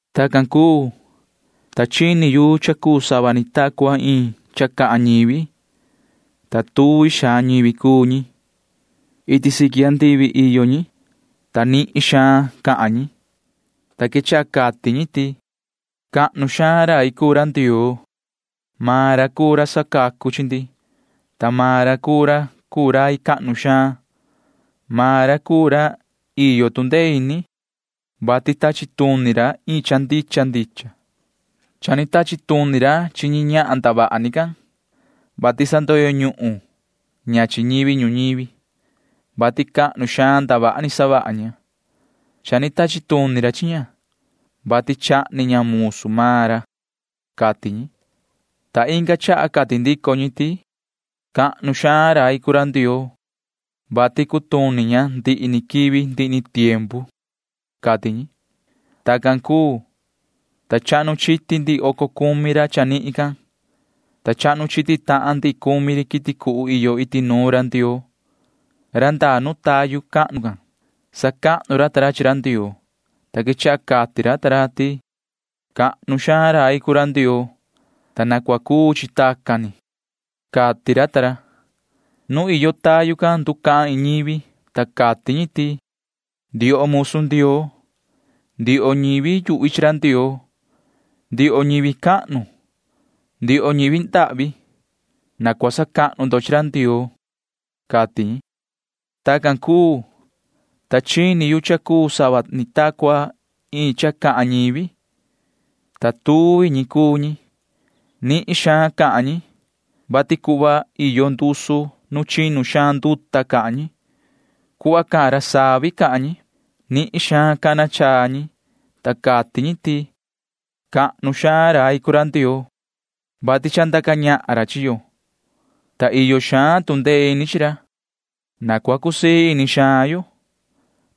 Tacan cuu, ta chini yu cha cuu sava ni ta cua iin cha cahan ñivi, ta tuvi xaan ñivi cuu ñi. Iti siqui andivi iyo ñi, ta nihin suhva cahan ñi, ta quechaha cati ñi ti: ¡Cahnu xaan rai cuu ra Ndioo! Maan ra cuu ra sacacu chi ndi, ta maan ra cuu ra cuu rai cahnu xaan. Maan ra cuu ra iyo tu ndee ini, vati tachi tuni ra iin cha ndicha ndicha. Cha ni tachi tuni ra chi ñahan ndavaha ni can, vati sandoyo ñuhun ña chi ñivi ñuñivi, vati cahnu xaan ndavaha ni savaha ña. Cha ni tachi tuni ra chi ña, vati chahni ña musu maan ra, cati ñi. Ta inga chaha cati ndico ñi ti: ―¡Cahnu xaan rai cuu ra Ndioo, vati cutuni ña ndihi ni quivi ndihi ni tiempu! ―cati ñi. Tacan cuu, ta chahnu chiti ndihi oco cumi ra chanihin, ta chahnu chiti tahan ndihi cumi ri quiti cuhu iyo iti nuun ra Ndioo―ra ndaa nu tayu cahnu can. Sacahnu ra ta ra chi ra Ndioo, ta quechaha cati ra ta ra ti: ―¡Cahnu xaan rai cuu ra Ndioo, ta na cua cuu chi tacan ni! ―cati ra. Nu iyo tayu can nducahan iin ñivi, ta cati ñi ti: Ndioho musu Ndioo, ndioho ñivi yuhvi chi ra Ndioo, ndioho ñivi cahnu, ndioho ñivi ndahvi―na cua sacahnu ndo chi ra Ndioo, cati ñi. Tacan cuu, ta chini yu cha cuu sava ni ta cua iin cha cahan ñivi, ta tuvi ñi cuu. Nihin xaan cahan ñi, vati cuhva iyo ndusu nu chinu xaan nduta cahan ñi. Cuhva cahan ra savi cahan ñi. Nihin xaan cana chaa ñi, ta cati ñi ti: ¡Cahnu xaan rai cuu ra Ndioo, vati cha ni ndaca ñahan ra chi yo, ta iyo xaan tu ndee ini chi ra! Na cua cusii ini xaan yo,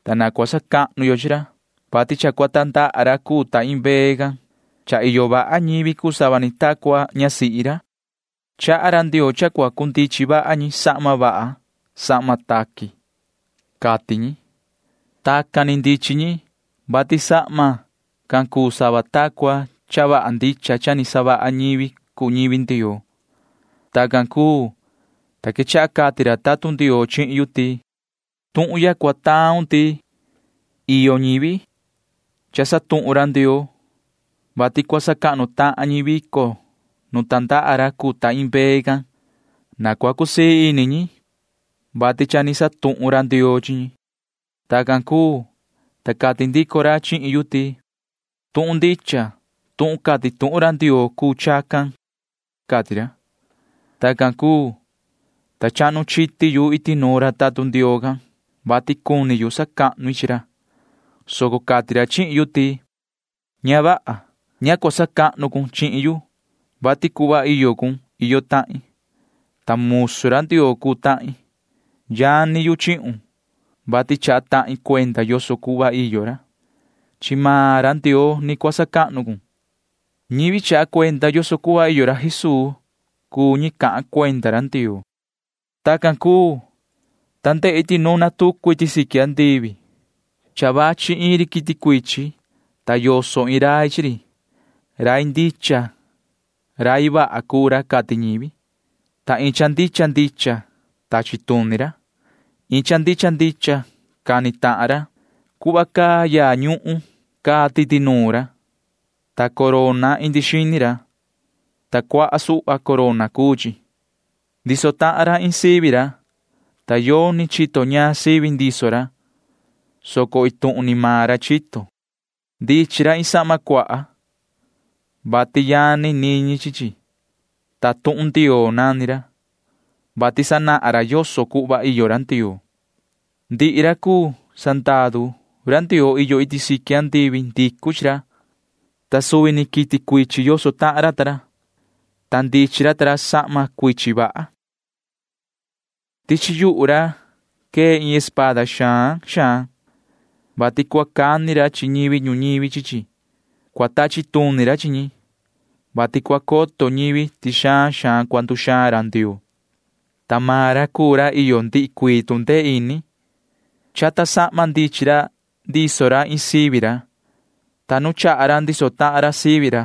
ta na cua sacahnu yo chi ra, vati cha cua tandaha ra cuu ta iin mbee can. Cha iyo vaha ñivi cuu sava ni ta cua ñasihi ra. Chaha ra Ndioo cha cundichin vaha ñi sahma vaha sahma taqui, cati ñi. Tacan ni ndichin ñi, vati sahma can cuu sava ta cua cha vaha ndicha cha ni savaha ñivi cuu ñivi Ndioo. Tacan cuu, ta quechaha cati ra tatun Ndioo chihin yu ti: ―Tuhun ya cua taun ti: “Iyo ñivi cana ñahan ra Ndioo, vati cua sacahnu tahan ñi vico nu tandaha ra cuu ta iin mbee can. Na cua cusii ini ñi, vati cha ni cana ñahan ra Ndioo chi ñi.” Tacan cuu, ta cati ndico ra chihin yu ti: ―Tuhun ndicha tuhun cati tuhun ra Ndioo cuu chacan ―cati ra. Tacan cuu, ta chahnu chiti yu iti nuun ra tatun Ndioo can, vati cuni yu sacahnu i chi ra, soco cati ra chihin yu ti: ―Ña vaha. Ña cua sacahnu cun chihin yu, vati cuhva iyo cun iyo tahin, ta musu ra Ndioo cuu tahin. Yani yu chihun, vati chaha tahin cuenda yoso cuhva iyo ra. Chi maan ra Ndioo ni cua sacahnu cun ―cati ra. Ñivi chaha cuenda yoso cuhva iyo ra Jesuu cuu ñi cahan cuenda ra Ndioo. Tacan cuu, ta ndehi ti nuna tucu iti siqui andivi. Cha vachi iin ri quiti cuichin, ta yoso iin rai chi ri. Rai ndicha rai vaha cuu ra cati ñivi, ta iin cha ndicha ndicha tachi tuni ra. Iin cha ndicha ndicha cani tahan ra. Cuhva caa yaa ñuhun caa titi nuun ra, ta corona indi xini ra, ta cuaha suhva corona cuu chi. Ndiso tahan ra iin sivi ra, ta yoni chito ñaan sivi ndiso ra, soco iin tuhun ni maan ra chito. Ndichin ra iin sahma cuaha, vati yani niñi chi chi, ta Tuhun Ndioo nani ra, [vati sanahan ra yoso cuhva iyo ra Ndioo]. Ndihi ra cuu sandaru Ndioo iyo iti siqui andivi ndicu chi ra, ta suvi ni quiti cuichin yoso tahan ra ta ra, ta ndichin ra ta ra sahma cuichin vaha. Tichi yuhu ra quee iin espada xaan xaan, vati cua cani ra chi ñivi ñuñivi chi chi. Cua tachi tuni ra chi ñi, vati cua coto ñivi ti xaan xaan cua nduxaan ra Ndioo, ta maan ra cuu ra iyo ndihi cuii tu ndee ini. Chata sahma ndichin ra ndiso ra iin sivi ra, ta nu chaha ra ndiso tahan ra sivi ra,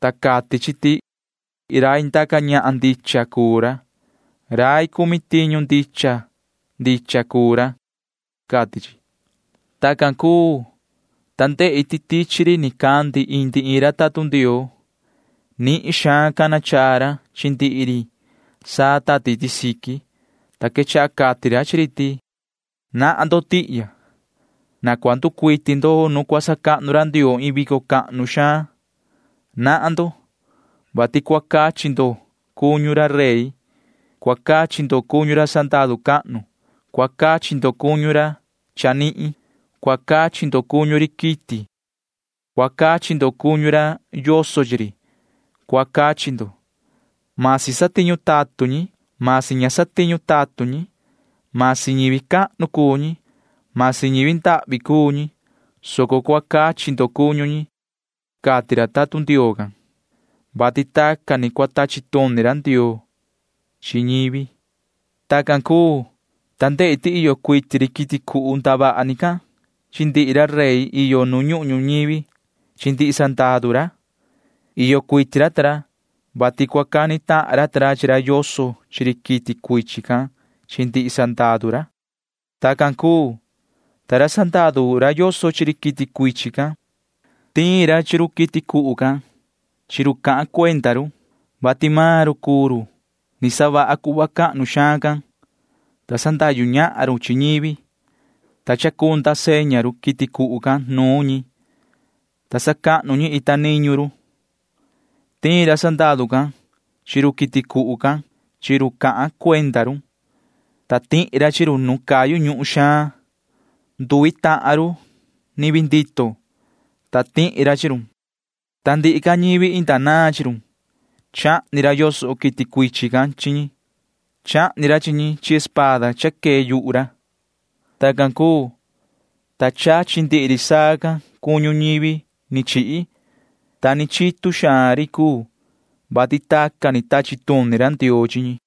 ta cati chi ti rai ndaca ñahan ndicha cuu ra. Rai cumi tiñu ndicha ndicha cuu ra, cati chi. Tacan cuu, ta ndehi ti tichi ri nicandi indi iin ra tatun Ndioo. Nihin xaan cana chaa ra chi ndihi ri saa tati iti siqui, ta quechaha cati ra chi ri ti: ―Nahan ndo tihya. Na cua nducuiti ndo nu cua sacahnu ra Ndioo iin vico cahnu xaan. Nahan ndo, vati cua cachi ndo cuñu ra rey. Cua cachi ndo cuñu ra sandaru cahnu. Cua cachi ndo cuñu ra chanihin. Cua cachi ndo cuñu ri quiti. Cua cachi ndo cuñu ra yoso chi ri. Cua cachi ndo. Masi satiñu tatun ñi, masi ña satiñu tatun ñi, masi ñivi cahnu cuu ñi, masi ñivi ndahvi cuu ñi, soco cua cachi ndo cuñu ñi ―cati ra tatun Ndioo can, [vati tacan ni cua tachi tuni ra Ndioo chi ñivi]. Tacan cuu, ta ndehi ti iyo cuiti ri quiti cuhu ndavaha ni can chi ndihi ra rey iyo nu ñuhun ñuñivi chi ndihi sandaru ra. Iyo cuiti ra ta ra, vati cua cani tahan ra ta ra chi ra yoso chi ri quiti cuichin can chi ndihi sandaru ra. Tacan cuu, ta ra sandaru ra yoso chi ri quiti cuichin can―tiin ra chi ri quiti cuhu can chi ra cahan cuenda run, vati maan ra cuu ra ni savaha cuhva cahnu xaan can, ta sandahyu ñahan ra chi ñivi, ta ndaa seña ri quiti cuhu can nuun ñi, ta sacahnu ñi ita niñu ri. Tiin ra sandaru can chi run quiti cuhu chi run cahan cuenda run, ta tihi ra chi run nu cayu ñuhun xaan. Nduvi tahan run ni vii ndito, ta tihi ra chi run. Ta ndihi ca ñivi inda naan chi run―chahni ra yoso quiti cuichin can chi ñi. Chahni ra chi ñi chi espada cha quee yuhu ra. Tacan cuu, ta chachi ndihi ri saa can cuñu ñivi ni chihi, ta ni chitu xaan ri cuu, [vati tacan ni tachi tuni ra Ndioo chi ñi].